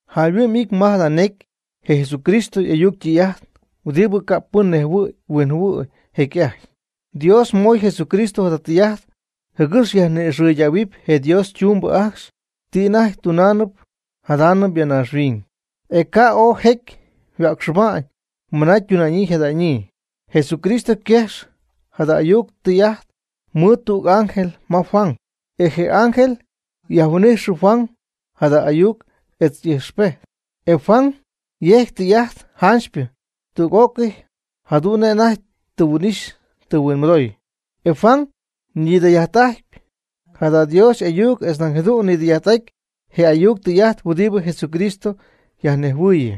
Jayhuɨ'my ity ma jada necy je Jesucristo y'ayuc ytɨy'ajt huɨdibɨ ca' pɨn nejhuɨ̈y huinjɨhuɨ̈y jecy'ajty. Dios moy Jesucristo jada tɨy'ajt jɨgɨx yajni'ixɨydähuɨpy je Dios ytumbɨ ajcxy ti anajty tunaanɨp jadaanɨp ya naaxhuiñ, e ca' ooy jecy yhuäcxɨba'ñ mɨna ytuna'ñyii yjada'ñyii. Jesucristo yquejxy jada ayuc tɨy'ajt mɨɨd tüg ángel ma Juan. E je ángel yajhuin'ijxy Juan jada y'ayuc etz ijxpejt. E Juan yejcy tɨy'ajt janchypɨ tüg'ócɨy jadu'n nej anajty tɨ huin'ixy tɨ huinmɨdoy. E Juan ñidɨy'ajt'ajtpy jada Dios y'ayuc etz nañ jadu'n nidɨy'ajt'aty je ayuc tɨy'ajt huɨdibɨ Jesucristo yajnejhuɨɨyɨ.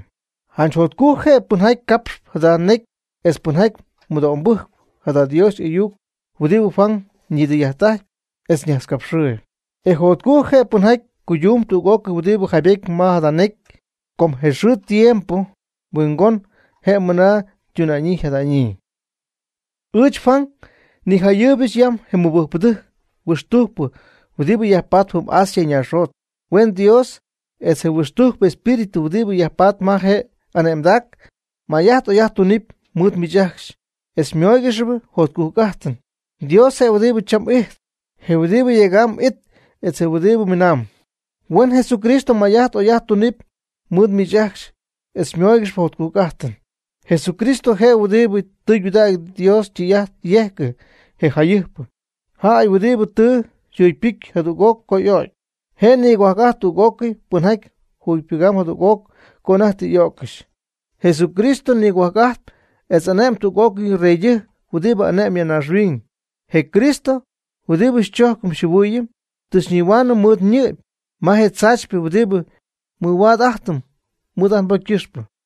Janch jotcujc je' pɨnjaty capxp jada necy etz pɨnjaty mɨdo'mbɨjc jada Dios y'ayuc huɨdibɨ Juan nidɨy'ajtpy etz ñajtzcapxɨɨyb. E jotcujc je' pɨnjaty cuydumb tüg'ócɨy huɨdibɨ jaybety ma jada necy, com je xɨɨ je tiempo huingoonɨñ je' mɨna ytuna'ñyii yjada'ñyii. Ɨɨch Juan nijayɨɨybɨch yam je mɨbɨjcpɨdɨjc huixtujcpɨcypɨ huɨdibɨ yajpatp jɨm Asia naaxjot. Huen Dios etz je huixtujcpɨ espíritu huɨdibɨ yajpatp ma je' y'ane'mdac may'ajt oy'ajt tunɨpy mɨɨd miich ajcxy etz xymóoygɨxɨpy jotcujc'ajtɨn. Dios je' huɨdibɨ cham ijtp, je huɨdibɨ jecy'ajty ijt, etz je huɨdibɨ miinaamb. Huen Jesucristo may'ajt oy'ajt tunɨpy mɨɨd miich ajcxy etz xymóoygɨxɨpy jotcujc'ajtɨn. Jesucristo je huɨdibɨ tɨydudägy Dios ytɨy'ajt yejcɨ, je jayɨjpɨ jäy huɨdibɨ tɨ yjugypɨcy jadüg'oc co y'o'cy, je' nigohuajc'ajtp tüg'ócɨy pɨnjaty jugypɨgɨp jadüg'oc co anajty tɨ y'öccɨxy. Jesucristo nigohuajc'ajtp etz ane'my tüg'ócɨy reydɨjc huɨdibɨ ane'mb ya naaxhuiñ. Je Cristo, huɨdibɨ xychojcɨm xyjɨhuɨɨyɨm, tɨ xyñihuaanɨm mɨɨd ñɨ'py ma je tzaachypɨ huɨdibɨ mɨhuaad'ajtɨm mɨɨd ajt nbocy ycɨxpɨ.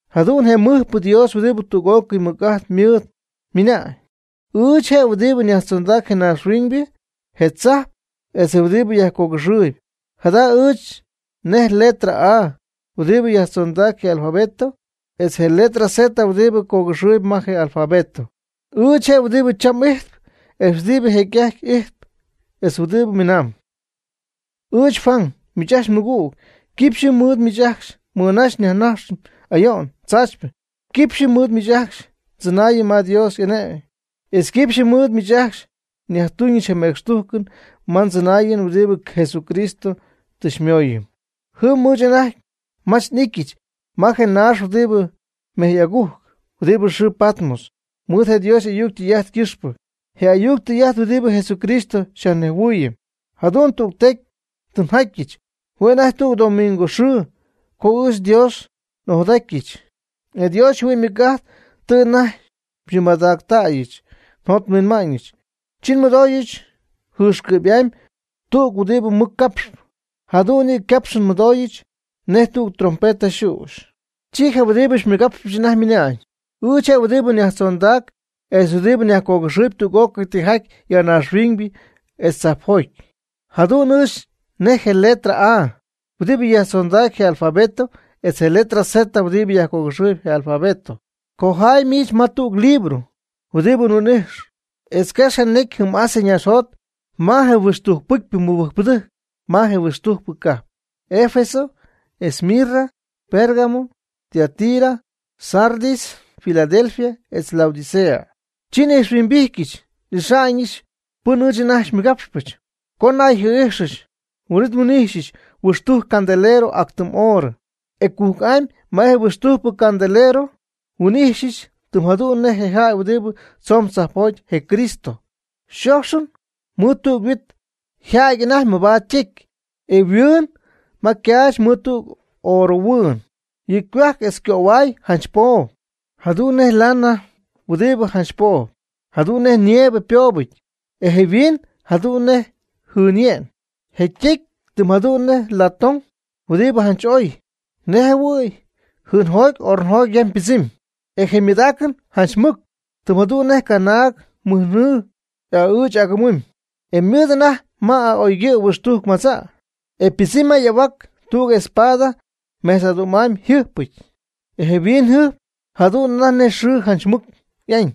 Jadu'n je mɨjpɨ Dios huɨdibɨ tüg'ócɨy mɨc'ajt mɨɨd ymɨna'ñ: ―Ɨɨch je' huɨdibɨ yajtzondacp je naaxhuiñybɨ, je tzajp etz je huɨdibɨ jaccogɨxɨɨyb. Jadu'n ɨɨch nej letra A huɨdibɨ yajzondacp je alfabeto etz je letra Z huɨdibɨ cogɨxɨɨyb ma je alfabeto. Ɨɨch je' huɨdibɨ cham'ijtp, etz huɨdibɨ jecy'ajtyp ijt etz huɨdibɨ miinaamb. Ɨɨch Juan, miich ajcxy mmɨgüg, quipxyɨ mɨɨd miich ajcxy nmɨnaxy nyajnaxyɨch ayo'n tzaachypɨ. Quipxyɨ mɨɨd miich ajcxy ndzɨnäyɨch ma Dios y'ane'my. Etz quipxyɨ mɨɨd miich ajcxy nyajtuñɨch je mecxtujcɨn ma ndzɨnaayɨn huɨdibɨ Jesucristo tɨ xymooyɨm. Jɨm ɨɨch anajty mach n'ityɨch ma je naax huɨdibɨ mejy agujc, huɨdibɨ xɨɨ Patmos, mɨɨd Dios y'ayuc ytɨy'ajt ycɨxpɨ, je ayuc tɨy'ajt huɨdibɨ Jesucristo xyajnejhuɨɨyɨm. Jadu'n tügtecy tɨ njatyɨch, hue' anajty tüg domingo xɨɨ co ɨɨch Dios n'ojadajtyɨch, e Dios yjɨhuɨ'ñ ymɨc'ajt tɨ anajty xymɨmadactayɨch njot nhuinma'ñɨch. Chi nmɨdooyɨch jɨɨxcɨ'py'amy tüg huɨdibɨ mɨc capx, jadu'n yɨ' ycapxɨn nmɨdooyɨch nej tüg trompeta yxüxy. Chi je huɨdibɨ xymɨgapxpɨch anajty ymɨnañ: ―Ɨɨch je' huɨdibɨ yajtzondacp etz je huɨdibɨ yajcogɨxɨɨyb tüg'ócɨy tijaty ya naaxhuiñybɨ etz tzajpjoty. Jadu'n ɨɨch nej je letra A huɨdibɨ yajtzondacp je alfabeto etz je letra Z huɨdibɨ yajcogɨxɨɨyb je alfabeto. Cojaay miich ma tüg libro huɨdibɨ mhuin'ijxyp, e quex je necy jɨm Asia naaxjot ma je huɨxtujc pɨcypɨ mɨbɨjcpɨdɨjc ma je huɨxtujcpɨ cajp: Efeso, Esmirna, Pérgamo, Teatira, Sardis, Filadelfia etz Laodicea. Chi n'ijxhuimbityɨch n'ixa'ñɨch pɨn ɨɨch anajty xymɨgapxpɨch. Co nnayjɨɨ'ijxɨch, huin'it nhuin'ijxyɨch huɨxtujc candelero ac tɨm oorɨ. E cujc'amy ma je huɨxtujcp candelero nhuin'ijxyɨch tɨm jadu'n nej je jäy huɨdibɨ tzoon tzajpjoty (je Cristo), yxoxyɨty mɨɨd tüg huit yjädy anajty mabaad ytecy, e yhuɨɨñɨty ma ycaach mɨɨd tüg oorɨhuɨɨn. Yɨ' ycohuajc etz ycöhuay janch poob, jadu'n nej lana huɨdibɨ janch poob, jadu'n nej nieve ypoobɨty, e je yhuɨɨn jadu'n nej jɨɨnye'n. Je' ytecy tɨm jadu'n nej latón huɨdibɨ janch oy, nej jɨhuɨ̈y jɨɨnjoty ornojoty yam ypɨdzɨmy. E je ymɨydaacɨn janch mɨc, tɨm jadu'n nej canaag mɨjnɨɨ y'a'ɨɨch y'agɨmɨmy. E ymɨɨd anajty ma a'oygɨ' huixtujc madza'. E ypɨdzɨmy ma y'ahuac tüg espada mejtz'adu'm'amy yjɨjpɨty. E yhuiñyjɨjp jadu'n anajty nej xɨɨ janch mɨc y'añ.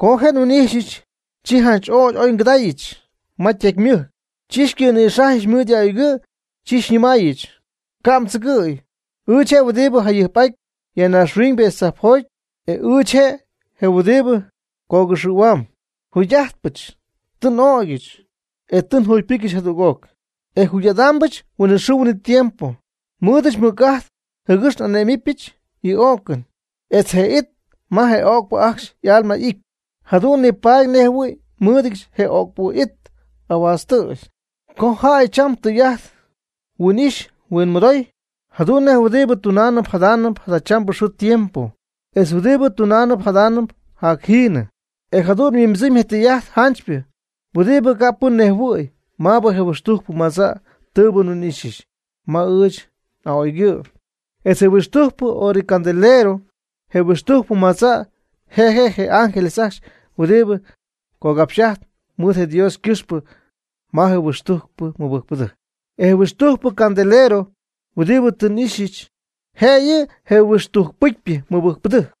Co je' nhuin'ijxyɨch, chi janch ögy oy ngɨdägyɨch ma ytecy ymɨjc, chi xycɨ̈nïxajyɨch mɨɨd y'a'oygɨ', chi xyñɨmaayɨch: ―Ca' mdzɨgɨ̈y; ɨɨch je' huɨdibɨ jayɨjp'ajtp ya naaxhuiñ etz tzajpjoty etz ɨɨch je' je huɨdibɨ cogɨxɨ̈huamb. Jugy'ajtpɨch; tɨ n'ögyɨch, e tɨ njugypɨcyɨch jadüg'oc, e jugy'adɨpɨch huinɨxɨɨ huinɨtiempo. Nmɨɨdɨch mɨc'ajt jɨgɨx ane'mɨbɨch yɨ o'cɨn etz je it ma je öcpɨ ajcxy y'alma ity. Jadu'n nipaady nej jɨhuɨ̈y nmɨɨdɨdyɨch je öcpɨ it ahuaaztɨ. Cojay cham tijaty mhuin'ijxpy mhuinmɨdooyb, jadu'n nej huɨdibɨ tunaanɨp jadaanɨp jadachambɨ xɨɨ tiempo, etz huɨdibɨ tunaanɨp jadaanɨp jacjiinɨ. E jadu'n yhuimbɨdzɨmy je tɨy'ajt janchypɨ huɨdibɨ ca' pɨn nejhuɨ̈y maabɨ je huɨxtujcpɨ madza' tɨɨbɨ mhuin'ixy ma ɨɨch n'a'oygɨ', etz je huɨxtujcpɨ orɨcandelero. Je huɨxtujcpɨ madza', je' je' je ángeles ajcxy huɨdibɨ cogapxy'ajtp mɨɨd Dios ycɨxpɨ ma je huɨxtujcpɨcypɨ mɨbɨjcpɨdɨjc. E je huɨxtujcpɨ candelero huɨdibɨ tɨ m'ixy, je' yɨ' je huɨxtujcpɨcypɨ mɨbɨjcpɨdɨjc.